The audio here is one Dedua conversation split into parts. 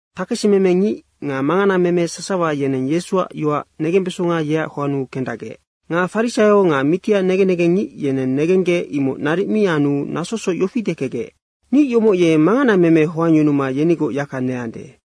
Takesimeme ngic nga manganameme sasawa yeneng Yesuac yoac negembesonga yeac hoannu kendacgec. Nga farisaio nga mitiac negen negengngic yeneng negenggec imoc naric mi anu nasosoc yofi dekecgec, “Ngic yomoc ye manganameme hoangyunuma yenigoc yaka neande.”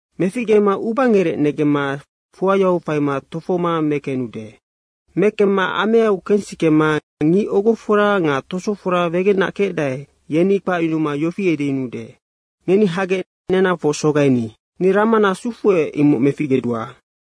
Meficgema ubangerec negemma fuayau faima tofohoma mekenude. Mekemma ameau kensikema ngic ogofora nga tosofora wegenac kecdae, yeni kpacyunuma yofi edeyunuude, ‘Ngeni hagec nenahafoc sogaini. Ni ramana sufuec, imoc meficgedua.’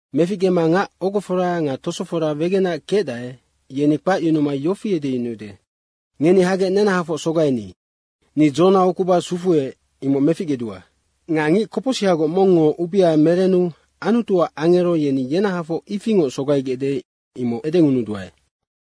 Meficgema ngac ogofora nga tosofora wegenac kecdae, yeni kpacyunuma yofi edeyunuude, ‘Ngeni hagec nenahafoc sogaini. Ni dzona ukuba sufuec, imoc meficgedua.’ Nga ngic kopocsihagoc mongngo ubea merenu Anutuac angero yeni yenahafoc ifingoc sogaigecde, imoc edengunuduae.”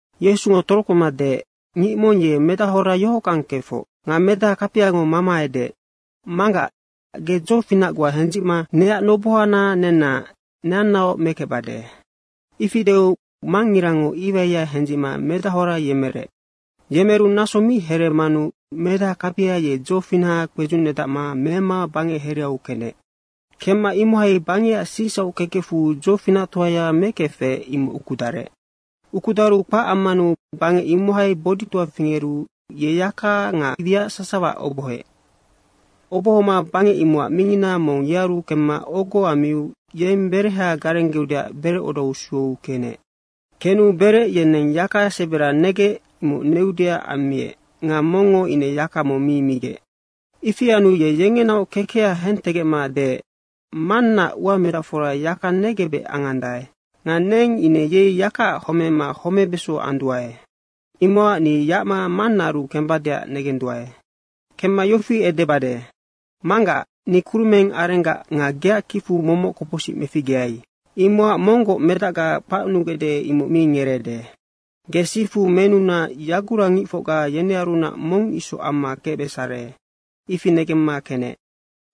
Yesungo torokpema deec, “Ngic mong ye medahora yohockang kefoc. Nga medaha kapiango mama edeec, ‘Manggac, ge dzofinac goa hendzicma neac nobohana nenna neannaoc mekecbade.’ Ifi deu mangngirango iwaiya hendzicma medahora yemerec. Yemeru naso mi hereemanu medaha kapia ye dzofinaha kpedzucnedacma mema bangec hereau kenec. Kemma imohai bangecac sicsauckekecfu dzofinactoaya mekefec, imoc ukudarec. Ukudaru kpac ammanu bangec imohai boditoa fingeru ye yaka nga wiac sasawaac obohoec. Obohoma bangec imocac mingina mong yearu kemma ogo ammiu yeng bereha garenggeudeac berecodau sueu kenec. Kenu berec yeneng yaka sebera negec, imoc neudeac ammiec nga mongngo ine yaka mong mi gumegec. Ifi anu ye yengenaoc kekeha hentegecma deec, ‘Mannaac uamedacfora yaka negebec angandae. Nga neng ine yei yakaac homema homebeso anduae. Imocac ni yacma mannaaru kembadeac negenduae. Kemma yofi edebade, “Manggac, ni kurumeng arenggac nga geac kicfu momoc kopocsic meficgeai, imocac monggoc medacga kpacnugecde, imoc mi ngereeude. Ge sifu menuna yagurangicfocga yenearunac mong isoc amma kecbesare.” ’ ifi negemma kenec.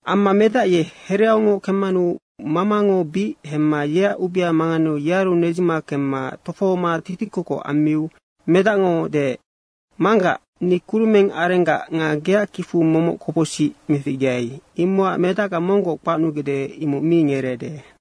Amma medac ye hereaungoc kemmanu mamango bic hemma yeac ubea manganeu yearu nedzima kemma tofohoma titikokoc ammiu medacngo deec, ‘Manggac, ni kurumeng arenggac nga geac kicfu momoc kopocsic meficgeai, imocac medacga monggoc kpacnugecde, imoc mi ngereeude.’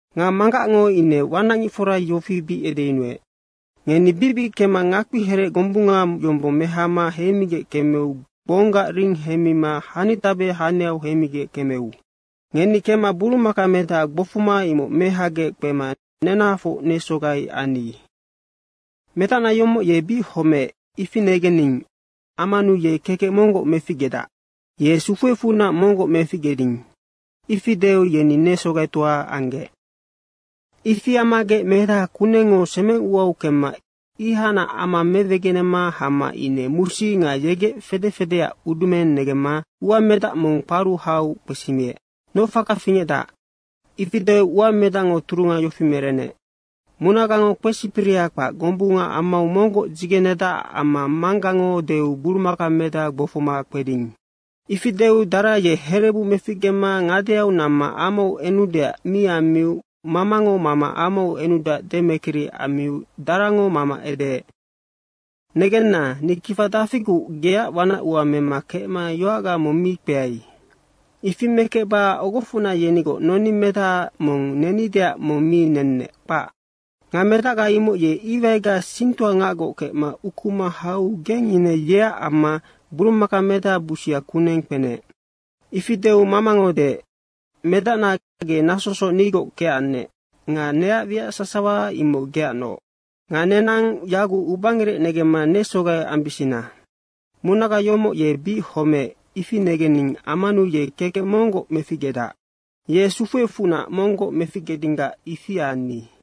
Nga manggacngo ine wanacngicfora yofi bic edeyunuec, ‘Ngeni bicbic kemma ngakpiherec gombunga yombong mehama heimigec kemeu gbonggac ring heimima hanitabe haniau heimigec kemeu. Ngeni kemma burumakamedaha gbofoma, imoc mehagec kpema nenahafoc nesogai anni. Medacna yomoc ye bic homeec, ifi negening ammanu ye kekec monggoc meficgedac. Ye sufuecfunac monggoc meficgeding.’ Ifi deu yeni nesogaitoa anggec. Ifi ammagec medaha kunengngo semeng uau kecma ihacnac ama mewegenema hama ine musi nga yegec fede fedeac udumeng negemma uamedac mong kparu hau kpesimiec, ‘Noc faka fingecde?’ Ifi deu uamedacngo turunga yofi merenec, ‘Munagango kpesipiriha kpac gombunga amau monggoc dzigenedacac amma manggango deu burumakamedaha gbofoma kpeding.’ Ifi deu dara ye herebu meficgema ngadeau namma amau enudeac mi ammiu mamango mama amau enudeac demekiri ammiu darango mama edeec, ‘Negenna, ni kifa dafiguc geac wanac ua mema kecma yoacga mong mi kpeai. Ifi mekecba ogofocna yenigoc noningmedaha mong nenideac mong mi nennec, kpac. Nga medacga imoc ye iwaiga singtoangacgoc kecma ukuma hau geng ine yeac amma burumakamedaha busia kuneng kpenec.’ Ifi deu mamango deec, ‘Medacna, ge nasosoc nigoc kecannec nga neac wiac sasawa imoc geacnoc. Nga nenang yaguc ubangerec negemma nesogai ambisina. Munaga yomoc ye bic homeec, ifi negening ammanu ye kekec monggoc meficgedac. Ye sufuecfunac monggoc meficgedinggac ifi anni.’”